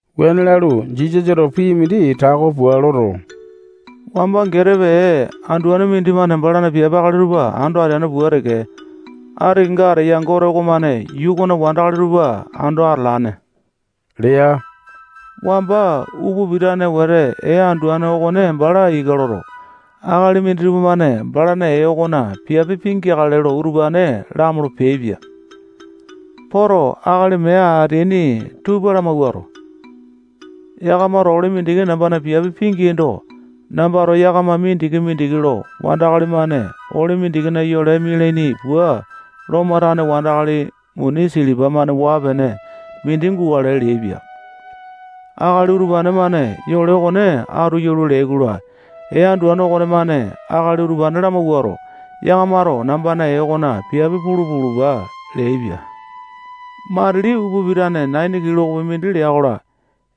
Wuane lalu, Jisasato pii mindi tako pua loto, wamba getepe ee anduane mindimane balana piape akali tupa ando ateane pua teke, ati kenga ateya Gote okomane yuu okona wandakali tupa ando atalane lea. Wamba upa pitane wete ee anduane okone bala ika loto, akali minditupa-mane balana ee okona piape pingeakale lo utupane lamolo peaipia. Poto, akali mee ateaini tupa lamawuato, yakamato ole mindiki nambana piape pingeaindo, nambato yakama mindiki-mindiki lo wandakali-mane ole mindikina yole mialiani pua, Lomo tane wandakali muni silipa-mane waa-pene mindi gukale leaipia. Akali utupane-mane yole okone atu yalua leai-kola, ee anduane okonemane akali utupane lamawuato, yakamato nambana ee okona piape pulu pulupa leaipia. Matili upa pitane naini kilokopi mindi lea-kola,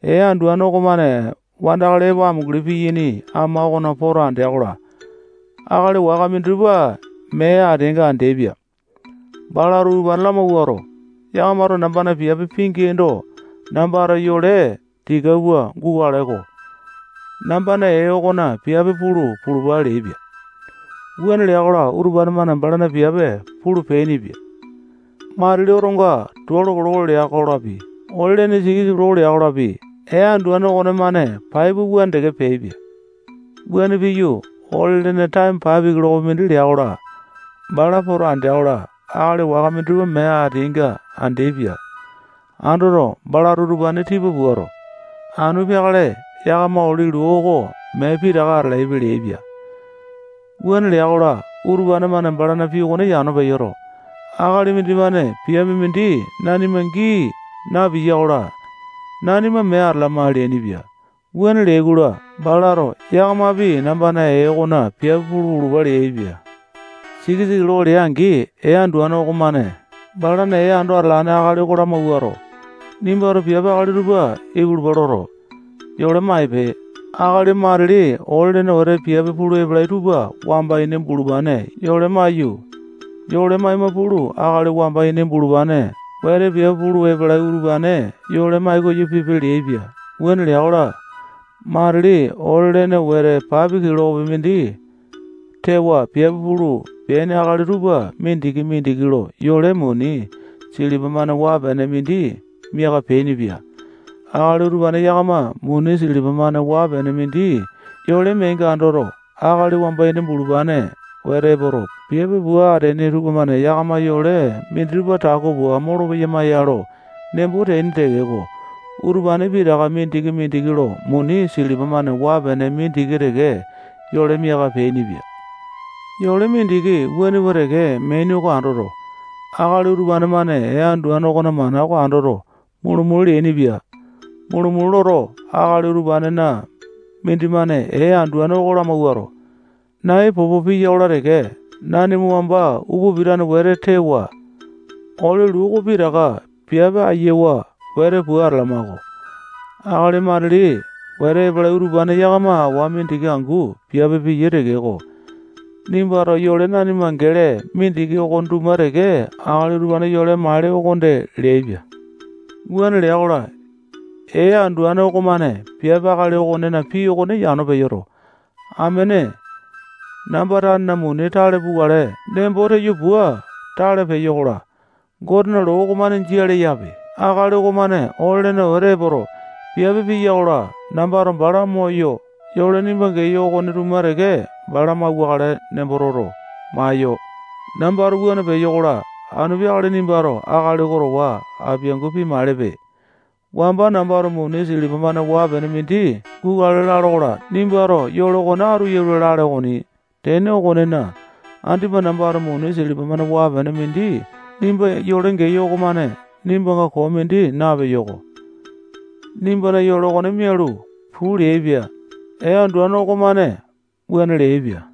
ee anduane okonemane wandakali epo amunguli piyaini ama okona poto andea-kola, akali waka minditupa mee ateainga andeaipia. Balato utupane lamawuato, yakamato nambana piape pingeaindo, nambato yole tika pua gukale-ko. Nambana ee okona piape pulu pulupa leaipia. Wuane lea-kola, utupane-mane balana piape pulu peainipia. Matili otonga tualo kiloko lea-kolapi, ole-lene siti kiloko lea-kolapi, ee anduane okonemane pai pua wuane teke peaipia. Wuane piyu, ole-lene taeme paepe kilokopi mindi lea-kola, bala poto andea-kola, akali waka minditupa mee ateainga andeaipia. Andoto, balato utupane tipa puato, anu peakale yakama ole luu oko pitaka mee atalaipe leaipia. Wuane lea-kola, utupane-mane balana pii okone yano peyoto, akali mindimane piape mindi nanima gii napiya-kola, nanima mee atalama leainipia. Wuane leai-kola, balato yakamapi nambana ee okona piape pulu pulupa leaipia. Sikisa kiloko lea-angi, ee anduane okomane balana ee ando atalane akali oko lamawuato, nimbato piape akali tupa ipulupa loto, yole maipe. Akali matili ole-lene wete piape pulu epalai tupa wamba ini bulupane yole maiyu, yole maima pulu, akali wamba ini bulupane wete piape pulu epalai utupane yole mai-koyo pipe leaipia. Wuane lea-kola, matili ole lene wete paepe kilokopi mindi tewa piape pulu peaini akali tupa mindiki-mindiki lo yole muni silipa-mane waa-pene mindi miaka peainipia. Akali utupane yakama muni silipa-mane waa-pene mindi yole meainga andoto, akali wamba ini bulupane wete epoto, piape pua ateaini tupamane yakama yole minditupa tako pua molopeyama ya lo nembo teaini tekeko, utupane pitaka mindiki-mindiki lo muni silipa-mane waa-pene mindiki teke yole miaka peainipia. Yole mindiki wuane pua teke meaini okone andoto, akali utupane-mane ee anduane okona mana okone andoto, mulu-mulu leainipia. Mulu-mulu loto, akali utupanena mindimane ee anduane oko lamawuato, nai popo piya-kola teke, nanima wamba upa pitane wete tewa, ole luu oko pitaka piape ayawa wete pua atalama-ko. Akali matili wete epalai utupane yakama awa mindiki angu piape piyai tekeko, nimbato yole nanima gele mindiki okone tuma teke akali utupane yole maele okonde leaipia. Wuane lea-kola, ee anduane okomane piape akali okonena pii okone yano peyoto, amene, namba tanena muni tale pukale nembo teyo pua tale peyo-kola, Gotena loo okomane jia leyape. Akali okomane ole-lene wete epoto, piape piyai-kola, nambato bala moyo yole nimba geyo okone tuma teke bala mauwakale nembo toto, maeyo. Nambato wuane peyo-kola, anu peakale nimbato akali okone towa apiangu pimailepe. Wamba nambato muni silipa-mane waa-pene mindi gukale lalo-kola, nimbato yole okone atu yalua lale okoni. Tene okonena, andipa nambato muni silipa-mane waa-pene mindi nimba yole geyo okomane nimbanga koo mindi napeyo-ko. Nimbana yole oko mialu, puu leaipia. Ee anduane okomane wuane leaipia.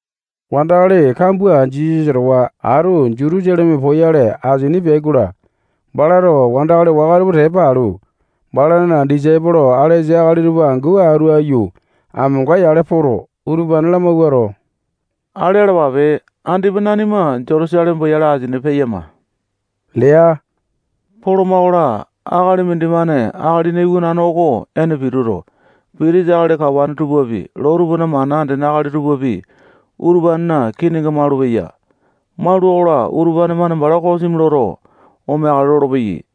Wandakali kambua Jisasa towa atu Jutusaleme poyale asini peai-kola, balato wandakali waka tupa tepa alu, balana disaipolo alesa akali tupa angu atu aiyu amonga-yale poto, utupane lamawuato, ale alapape. Andipa nanima Jutusaleme poyale asini peyama lea. Poloma-kola, akali mindimane Akalina Iwanane oko ene pituto, pitisa akali kawane tupapi, loo tupana mana andene akali tupapi, utupanena kininga malupeya. Maula-kola, utupane-mane bala kosimi loto, omeakale lolopeyai.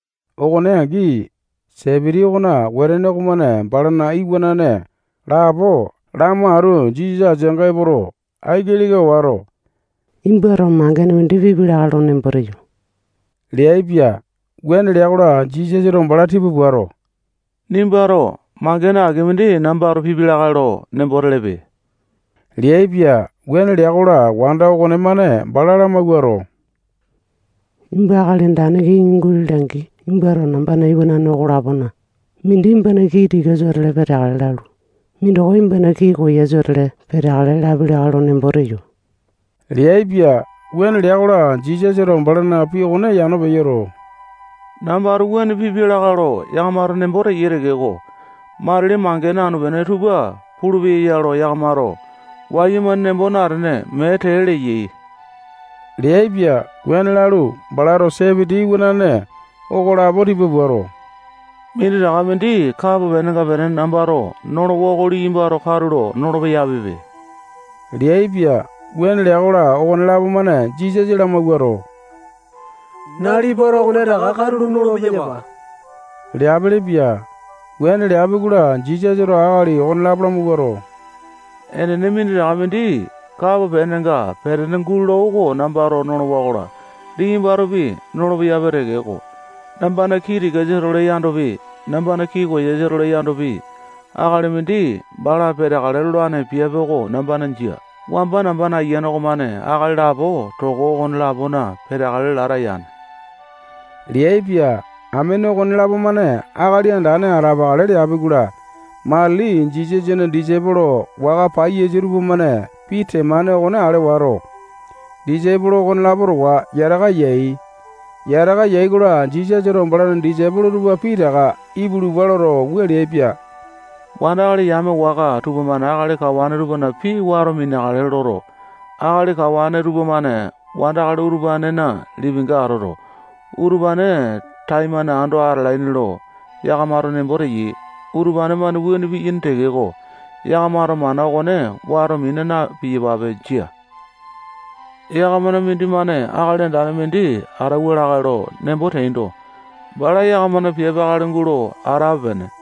Okone angi, Sepiti okona wetene okomane balana iwanane lapo lamo atu Jisasa ateanga epoto, aiki leka wato, nimbato mangene mindi pipi lakae lo nembo teyo leaipia. Wuane lea-kola, Jisasato bala tipa puato, nimbato mangene aki mindi nambato pipia lakae lo nembo telepe leaipia. Wuane lea-kola, wanda okonemane bala lamawuato, nimba akali andane kiŋi gulole-angi, nimbato nambana iwanane okolapona mindi nimbana kii tikasa-tole peteakale lalu, mindoko nimbana kii koyasa-tole peteakale lapi lakae lo nembo teyo leaipia. Wuane lea-kola, Jisasato balana pii okone yano peyoto, nambato wuane pipia lakae lo yakamato nembo teyai tekeko, matili mangene anu-pene tupa pulu-peyape lo yakamato wayumane nembo natene, mee tee leyai leaipia. Wuane lalu, balato Sepiti iwanane okolapo tipa puato, minditaka mindi kapo penenga petene nambato nolowa oko liyambato katulo nolo-peyapipe leaipia. Wuane lea-kola, okonelapo-mane Jisasa lamawuato, nalipato okonetaka katulo nolo-peyapa leapelepia. Wuane leapi-kola, Jisasato akali okonelapo lamawuato, enene, minditaka mindi kapo penenga petene gulola oko nambato nolowa-kola, liyambatopi nolo-peyapi tekeko, nambana kii tikasa-tole yandopi, nambana kii koyasa-tole yandopi, akali mindi bala peteakale lolane piape oko nambana jia. Wamba nambana ayiane okomane akali lapo toko okone-lapona peteakale lata yane leaipia. Amene okonelapo-mane akali andane atapakale leapi-kola, matili Jisasana disaipolo waka paiyasa tupamane pii temane okone ale wato, disaipolo okonelapo towa yataka yai. Yataka yai-kola, Jisasato balana disaipolo tupa pitaka ipulupa loto, wua leaipia: Wandakali yame waka tupamane akali kawane tupana pii wato mineakale loto, akali kawane tupamane wandakali utupanena lipinga atoto, utupane taimane ando atalaini lo yakamato nembo teyai. Utupane-mane wuane piyaini tekeko, yakamato mana okone wato mina na-piyapape. Jia. Yakamana mindimane akali andane mindi atauwa lakae lo nembo teando, bala yakamana piape akali gulo atape-pene.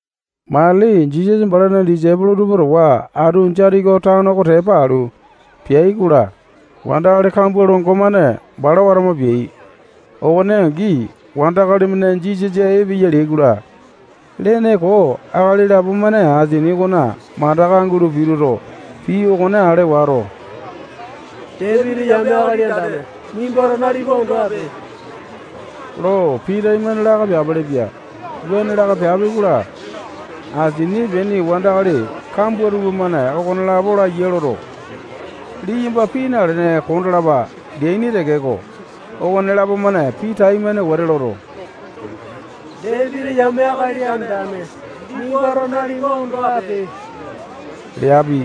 Matili Jisasa balana disaipolo tupa towa atu Jetiko tano oko tepa alu peai-kola, wandakali kambua longo-mane bala watama peai. Okone angi, wandakali-mane Jisasa epeya leai-kola, lene koo akali lapo-mane asini okona mandaka gulo pituto, pii okone ale wato, Dapiti yame Akali Andane nimbato nalipa ondo ape lo pii taimane laka peapelepia. Wuane laka peapi-kola, asini epeaini wandakali kambua tupamane okonelapo laiya loto, liyamba pii nalene kondalapa leaini tekeko, okonelapo-mane pii taimane wete loto, Dapiti yame Akali Andane nimbato nalipa ondo ape leapi.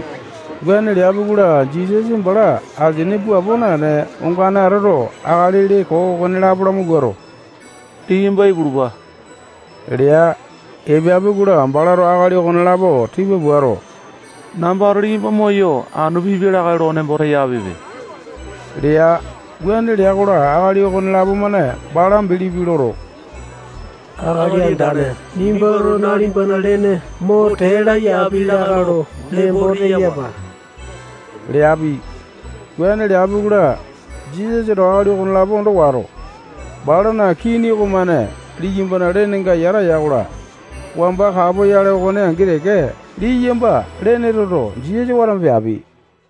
Wuane leapi-kola, Jisasa bala asini puapo naene, ongane atoto, akali lee koo okonelapo lamawuato, liyamba ipulupa lea. Epeapi-kola, balato akali okonelapo tipa puato, nambato liyamba moyo, anu pipi lakae lo nembo teyapipe lea. Wuane lea-kola, akali okonelapo-mane bala bilipi loto, Akali Andane, nimbato nalipana lene mo tee laya api lakae lo nembo teyapa leapi. Wuane leapi-kola, Jisasato akali okonelapo ondo wato, balana kini okomane liyambana lenenga yata ya-kola, wamba kapoyale okone angi teke, liyamba lene toto, Jisasa watama peapi.